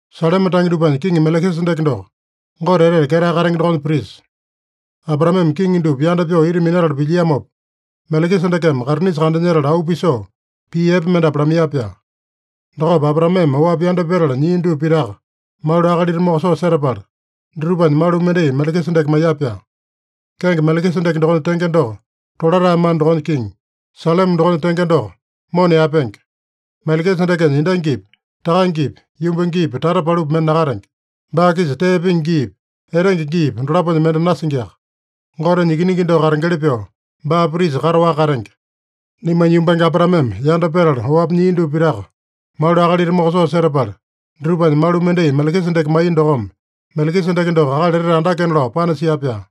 Saleme tange dupanya kiŋi Melekisedeke doko, Gote Etete Ketae Katenge dokonya prisa. Abraameme kiŋi dupa yanda pyoo ita minatala pilyiamopa, Melekisedekeme kaitinisa kandanyetala auu pisoo pii epe mendapu lamaiya-pyaa. Dokopa Abraameme oapi yanda petala nyia dupa pitaka malu akalita mokosoo setapala, dutupanya malu mendai Melekisedeke maiya-pyaa. Kenge Melekisedeke dokonya tenge doko, Tolatae mana dokonya kiŋi. Saleme dokonya tenge doko, Mona yaepenge. Melekisedekenya endangipi, takangepi, yumbangepi, tata palupi mende nakatenge. Baa-kisa tee pingi giipa, etenge giipa, dolaponya mende nasingiaka. Gotenya Ikiningi doko katengeli pyoo, baa prisa kataowaka katenge. Naimanya yumbange Abraameme yanda petala oapi nyia dupa pitaka malu akalita mokosoo setapala, dutupanya malu mendai Melekisedeke maiya dokome, Melekisedeke doko akali etete andakena lao panasia-pyaa.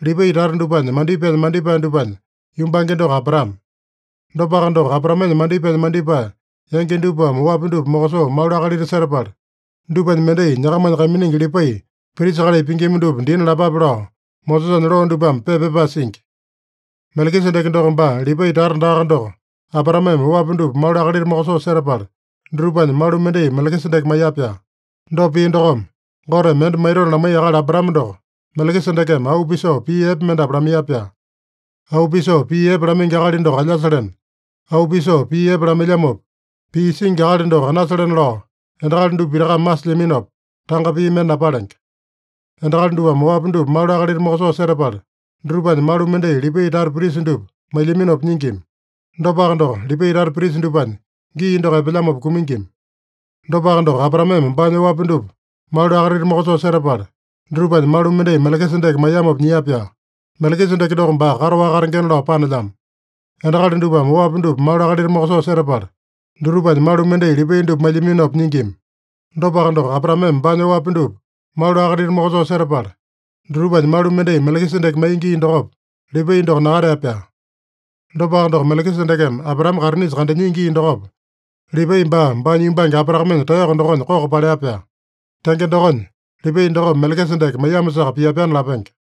Lipai tata dupanya mandipaenya mandipae dupanya yumbange doko Abraame. Dopaka doko, Abraamenya mandipaenya mandipae yangi dupame oapi dupa mokosoo malu akalita setapala, dupanya mendai nyakamanya kaiminingi Lipai, prisa kalai pingima dupa dina lapape lao Mosesanya loo dupame pepa pyapae singi. Melekisedeke doko baa Lipai tata daaka doko, Abraameme oapi dupa malu akalita mokosoo setapala, dutupanya malu mendai Melekisedeke maiya-pyaa. Dopa pia dokome, Goteme mende maitona lamaiya akali Abraame doko, Melekisedekeme auu pisoo pii epe mendapu lamaiya-pyaa. Auu pisoo pii epe lamaingi akali doko alyasalena, auu pisoo pii epe lamailyamopa pii singi akali doko anasalena lao endakali dupa pitakame masilyaminopa, tanga pii mende napalenge. Endakali dupame oapi dupa malu akalita mokosoo setapala, dutupanya malu mendai Lipai tata prisa dupa mailyaminopa nyingima. Dopaka doko, Lipai tata prisa dupanya gii doko epelyamopa kumingima. Dopaka doko, Abraameme baanya oapi dupa malu akalita mokosoo setapala, dutupanya malu mendai Melekisedeke maiyamopa nyia-pyaa. Melekisedeke doko baa kataowaka katengena lao panelyamo. Endakali dupame oapi dupa malu akalita mokosoo setapala, dutupanya malu mendai Lipai dupa mailyaminopa nyingima. Dopaka doko, Abraameme baanya oapi dupa malu akalita mokosoo setapala, dutupanya malu mendai Melekisedeke maiya gii dokopa, Lipai doko nakatea-pyaa. Dopaka doko, Melekisedekeme Abraame kaitinisa kandanyia gii dokopa, Lipai baa, baanya yumbange Abraamenya taeyoko dokonya koko palea-pyaa. Tenge dokonya, Lipai dokome Melekisedeke maiyamosaka pia-pyaana lapenge.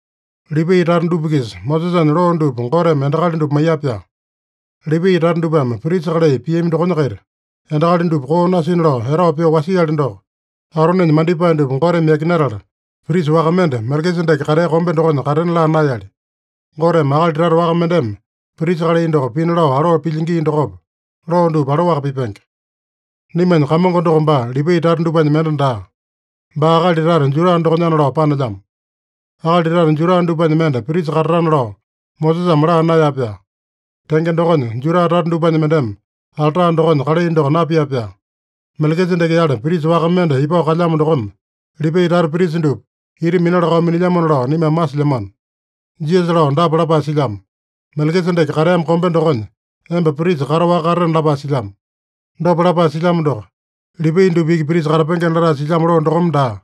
Lipai tata dupa-kisa Mosesanya loo dupa Goteme endakali dupa maiya-pyaa. Lipai tata dupame prisa kalai piami dokonya-kaita, endakali dupa koo nasina lao etao pyoo wasiali doko, Aronenya mandipae dupa Goteme yakinatala, prisa waka mende, Melekisedeke katea kombe dokonya katena laa naeyali. Goteme akali tata waka mendeme prisa kalai doko pina lao aloo pilya gii dokopa, loo dupa aloaka pipenge. Naimanya Kamongo doko baa Lipai tata dupanya mende daa. Baa akali tata Juda dokonyana lao panelyamo. Akali tata Juda dupanya mende prisa katatana lao Mosesame laa naeya-pyaa. Tenge dokonya, Juda tata dupanya mendeme alta dokonya kalai doko napia-pyaa. Melekisedeke-yale prisa waka mende ipao kalyamo dokome, Lipai tata prisa dupa ita minala-kao minilyamona lao naimame masilyamano. Jisasa lao dapa lapae silyamo: “Melekisedeke kateamo kombe dokonya emba prisa kataowaka katatena” lapae silyamo. Dopa lapae silyamo doko, Lipai dupa iki prisa katapengena latae silyamo loo dokome daa,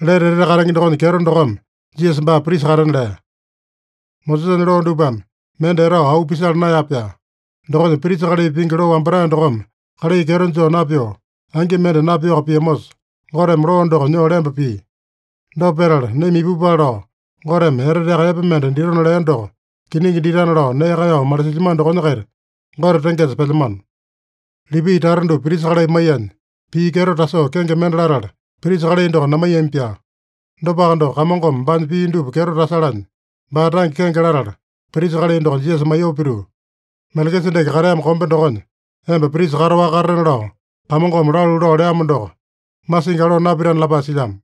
lete etete katenge dokonya kyeto dokome Jisasa baa prisa katena lea. Mosesanya loo dupame mende etao auu pisala naeya-pyaa. Dokonya, prisa kalai pingi loo wambatae dokome kalai kyeto joo napyoo, angi mende napyoaka piamosa, Goteme loo doko nyoo lemba pia. Dopa petala, naima ipupale lao Goteme eteteaka epe mende ditona lea doko kiningi ditana lao nee kaeyao malisilyamano dokonya-kaita Gote tengesa pelyamano. Lipai tata dupa prisa kalai maiyanya, pii kyeto tasoo kenge mende latala, prisa kalai doko namaiyami-pyaa. Dopaka doko, Kamongome baanya pii dupa kyeto tasalanya, baa tange kenge latala, prisa kalai doko Jisasa maiyoo pituu, “ ‘Melekisedeke kateamo kombe dokonya emba prisa kataowaka katatena’ lao Kamongome lalu lao leamo doko, masingi aloo napitana” lapae silyamo.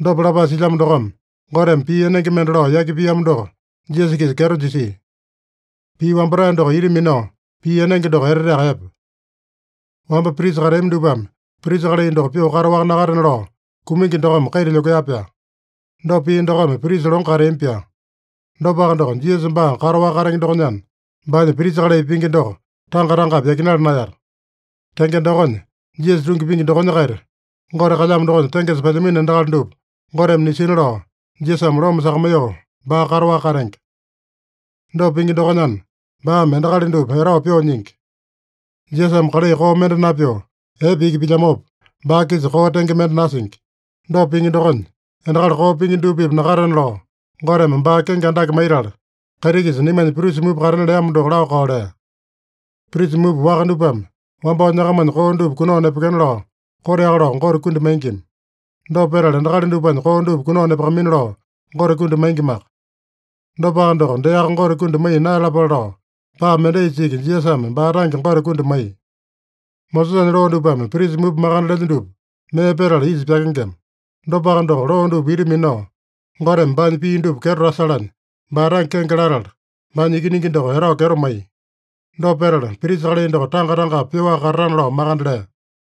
Dopa lapae silyamo dokome, Goteme pii enenge mende lao yaki piamo doko Jisasa-kisa kyeto jisia. Pii wambatae doko ita minao pii enenge doko eteteaka epe. Wamba prisa kateami dupame prisa kalai doko pyoo kataowaka nakatena lao, kumingi dokome kaita lyokea-pyaa. Dopa pia dokome prisa longo kateami-pyaa. Dopaka doko, Jisasa baa kataowaka katenge dokonyana, baanya prisa kalai pingi doko tanga-tangapi yakinala naeyata. Tenge dokonya, Jisasa tungi pingi dokonya-kaita Gote kalyamo dokonya tengesa pelyamino endakali dupa, Goteme nisina lao Jisasame loma sakamaiyoo, baa kataowaka katenge. Dopa pingi dokonyana, baame endakali dupa etao pyoo nyingi. Jisasame kalai koo mende napyoo, epe iki pilyamopa, baa-kisa koo tenge mende nasingi. Dopa pingi dokonya, endakali koo pingi dupa-pipa nakatena lao, Goteme baa kenge andake maitala, kaiti-kisa naimanya prisa mupa katena leamo doko laa-kao lea. Prisa mupa waka dupame wambao nyakamanya koo dupa kunao nepekena lao koteaka lao Gote kundi maingima. Dopa petala, endakali dupanya koo dupa kunao nepakamaina lao Gote kundi maingimaka. Dopaka doko, deaka Gote kundi maiya naeyalapale lao paa mendaisa iki Jisasame baa tange Gote kundi maiya. Mosesanya loo dupame prisa mupa makande lelya dupa mee petala isa pyakengema. Dopaka doko, loo dupa ita minao, Goteme baanya pii dupa kyeto tasalanya, baa tange kenge latala, baanya Ikiningi doko etao kyeto maiya. Dopa petala, prisa kalai doko tanga-tangapi pyoaka katatana lao makande lea.